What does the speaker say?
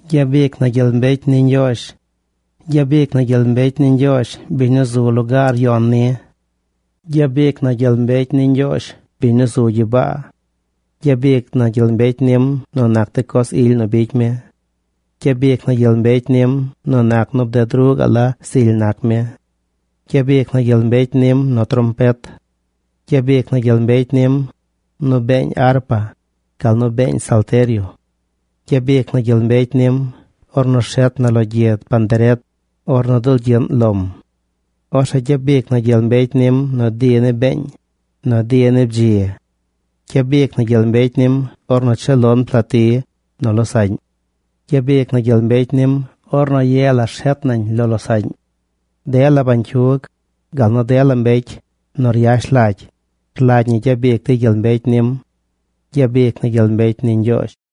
¡Gyabic na gyel mbecy ni Ñgyoozh! ¡Gyabic na gyel mbecy ni Ñgyoozh, biñ nu zu lugaar yon nim! ¡Gyabic na gyel mbecy ni Ñgyoozh, biñ nu zu gyibaa! Gyabic na gyel mbecy nim nu nac de coz ily nu bicy mi. Gyabic na gyel mbecy nim nu nac nu bded ruꞌ gaꞌ la zily nac mi. Gyabic na gyel mbecy nim nu trompet. Gyabic na gyel mbecy nim, nu beeñ arpa, gal nu beeñ salterio. Gyabic na gyel mbecy nim ornu rshet na lo gyid panderet ornu dulgyiꞌn lom. Orzeꞌ gyabic na gyel mbecy nim nu di ni beeñ, nu di ni bdzi. Gyabic na gyel mbecy nim ornu cheel lon plati nu losaꞌñ. Gyabic na gyel mbecy nim ornu ye la rshet nañ lo losaꞌñ. Dela bañcyug, gal nu dela mbecy nu ryash lagy, rlagy ñi nu gyabic dey gyel mbecy nim. ¡Gyabic na gyel mbecy ni Ñgyoozh!